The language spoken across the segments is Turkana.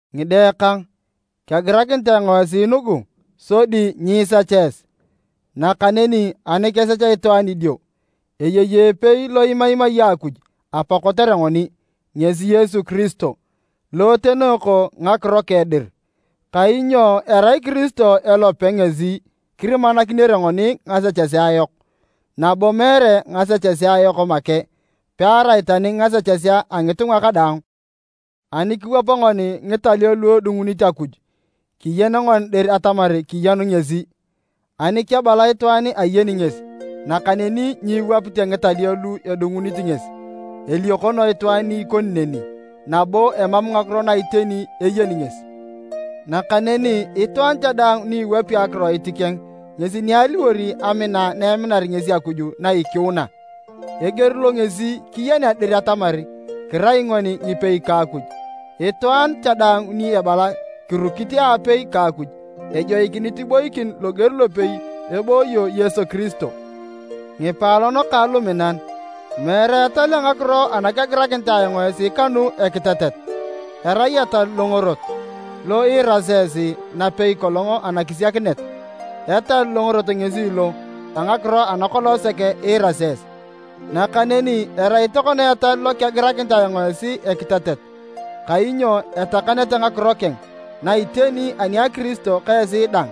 Ngide kang, kegirakinit ayong esi nugu sodi nyiisecha esi, nakaneni ani kesech itwaan idio, eyei epei lo imaimai Akuj Apa kotere ngoni, ngesi Yesu Kiristo, lo etenooko ngakiro keng dir. Kainyo erai Kiristo elope ngesi kirimakinere ngoni ngasechesea yok, nabo meere ngasechesea yok make, pearai tani ngasechesea a ngitunga kadaang. Ani kiwap ngoni ngitalio lu edungunit Akuj, kiyeni ngoni dir atamar kiyenu ngesi. Ani kebala itwaan ayeni ngesi, nakaneni nyiwapite ngitalio lu edungunit ngesi, eliokono itwaan ni ikoni neni nabo emam ngakiro na iteni eyeni ngesi. Nakaneni itwaan cha daang ni iwapi akiroit keng ngesi ni aliwor amina na eminar ngesi Akuj na ikiuna. Eger lo ngesi kiyenea dir atamar kirai ngoni ngipei ka Akuj, itwaan cha daang ni ebala kirukit aapei ka Akuj, ejoikinit iboikin loger lopei ebooyo Yesu Kiristo. Ngipaalon kang luminan, meere etal a ngakiro ana kegirakinit ayong esi kanu ekitetet, erai etal longorot, lo iirasi esi napei kolong anakisiakinet. Etal longorot ngesi lo a ngakiro ana kolong sek iirasi esi. Nakaneni erai tokona etal lo kegirakinit ayong esi ekitetet, kainyo etakanete ngakiro keng na iteni ani a Kiristo ka esi dang.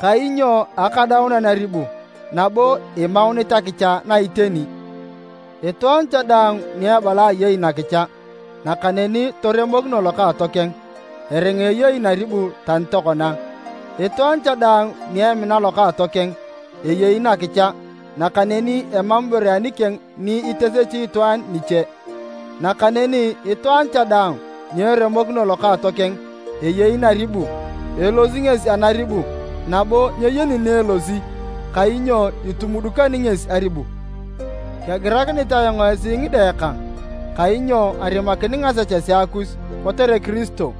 Kainyo akadaunan aribu nabo imaunit akicha na iteni. Itwaan cha daang ni ebala ayei nakicha, nakaneni toremokino lokaatokeng, eringa eyei naribu tani tokona. Itwaan cha daang ni emina lokaatokeng, eyei nakicha, nakaneni emam ibore anikeng ni itesechi itwaan niche. Nakaneni itwaan cha daang ni eremokino lokaatokeng, eyei naribu, elosi ngesi anaribu nabo nyeyeni ni elosi kainyo etumudukan ngesi aribu. Kegirakinit ayong esi ngide kang, kainyo arimakin ngasechesea kus kotere Kiristo.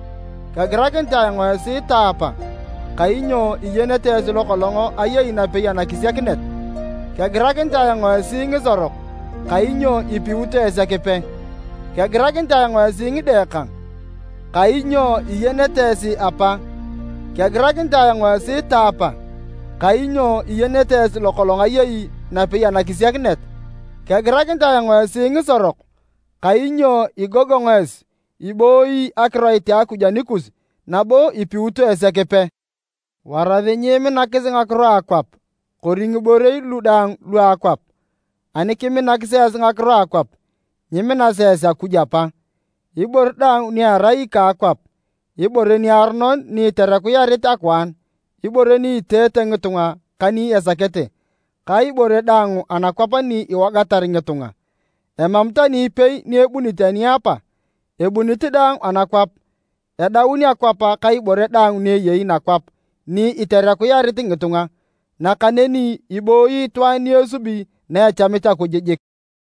Kegirakinit ayong esi taapa, kainyo iyenete esi lo kolong ayei napei anakisiakinet. Kegirakinit ayong esi ngisorok, kainyo ipiut esi Ekipe. Kegirakinit ayong esi ngide kang, kainyo iyenete esi Apa. Kegirakinit ayong esi taapa, kainyo iyenete esi lo kolong ayei napei anakisiakinet. Kegirakinit ayong esi ngisorok, kainyo igogong esi, ibooyi akiroit a Akuj anikus nabo ipiut esi Ekipe. Warasi nyiiminakis ngakiro a akwap kori ngiborei lu daang lua akwap. Ani kiminakis esi ngakiro a akwap, nyiminasi esi Akuj Apa. Ibore daang ni erai ika akwap, ibore niaronon ni iterekuyarit akwaan, ibore ni iteete ngitunga ka ni esakete, ka ibore daang anakwap ni iwogatar ngitunga, emam tani ipei ni ebunit ani a Apa, ebunit daang anakwap. Edaun akwap ka ibore daang ni eyei nakwap ni iterekuyarit ngitunga, nakaneni ibooyi itwaan ni esubi na echamit Akuj jik.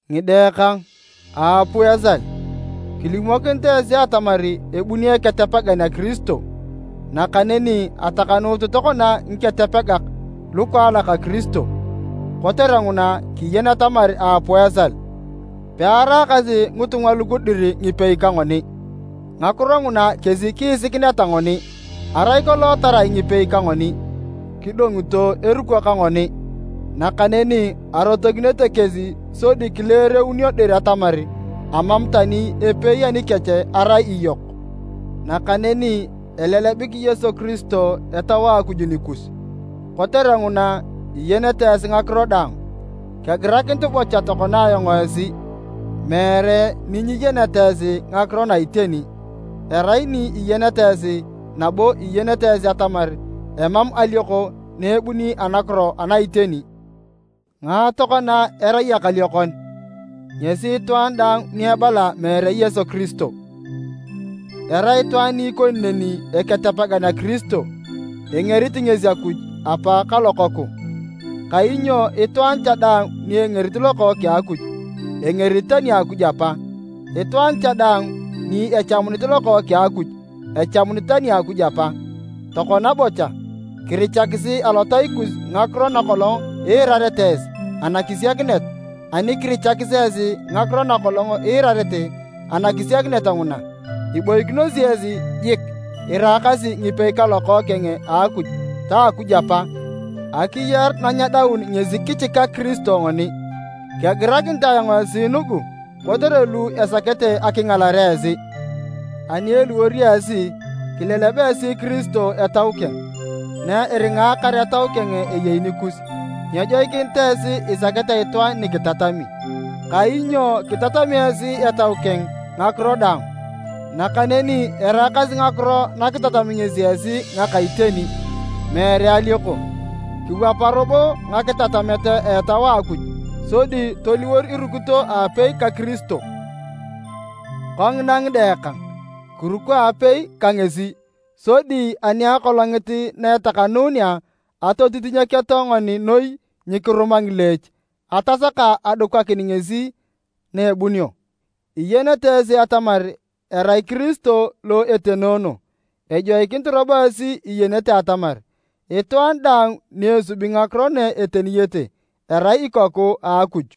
Ngide kang, aapuu esal! Kilimokin esi atamar ebuni Eketepegan a Kiristo, nakaneni atakanuut tokona ngiketepegak lukaalak a Kiristo, kotere nguna kiyeni atamar aapuu esal. Pearaakasi ngitunga lugu dir ngipei ka ngoni, ngakiro nguna kesi kiisikineta ngoni, arai kolong tarai ngipei ka ngoni, kidongoto eruko ka ngoni. Nakaneni arotokinete kesi sodi kileereunio dir atamar amam tani epei anikech arai iyok. Nakaneni elelebik Yesu Kiristo Etau a Akuj nikus, kotere nguna, iyenete esi ngakiro daang. Kegirakinit bocha tokona ayong esi, meere ni nyiyeneta esi ngakiro na iteni, erai ni iyeneta esi, nabo iyenete esi atamar emam alioko na ebuni anakiro ana iteni. Ngae tokona erai ekaliokon? Ngesi itwaan daang ni ebala meere Yesu Kiristo. Erai itwaan ni ikoni neni Eketepegan a Kiristo, engerit ngesi Akuj Apa ka Lokookeng. Kainyo itwaan cha daang ni engerit Lokookeng a Akuj, engerit tani Akuj Apa, itwaan cha daang ni echamunit Lokookeng a Akuj, echamunit tani Akuj Apa. Tokona bocha, kirichakisi alotai kus ngakiro na kolong iirarete esi anakisiakinet, ani kirichakis esi ngakiro na kolong iirarete anakisiakinet nguna, iboikinosi esi jiik iraakasi ngipei ka Lokookeng a Akuj ta Akuj Apa. Akiyar na nyedaun ngesi kichikak Kiristo ngoni. Kegirakinit ayong esi nugu kotere lu esakete akingalare esi. Ani eliwor esi, kileleb esi Kiristo Etau keng. Na eringaakar Etau keng eyei nikus, nyejoikinit esi isakete itwaan ni kitatami. Kainyo kitatami esi Etau keng ngakiro daang, nakaneni eraakasi ngakiro na kitatami ngesi esi ngaka iteni, meere alioko. Kiwapa robo ngakitatamet a Etau a Akuj sodi toliwor irukito aapei ka Kiristo. Kongina ngide kang, kiruko aapei ka ngesi, sodi ani Akolongit na etakanuunea, atotitinyeketo ngoni noi nyikiruma ngileech atasaka adukakin ngesi na ebunio. Iyenete esi atamar erai Kiristo lo etenoono, ejoikinit robo esi iyenete atamar itwaan daang ni esubi ngakiro na eteniyete, erai ikoku a Akuj.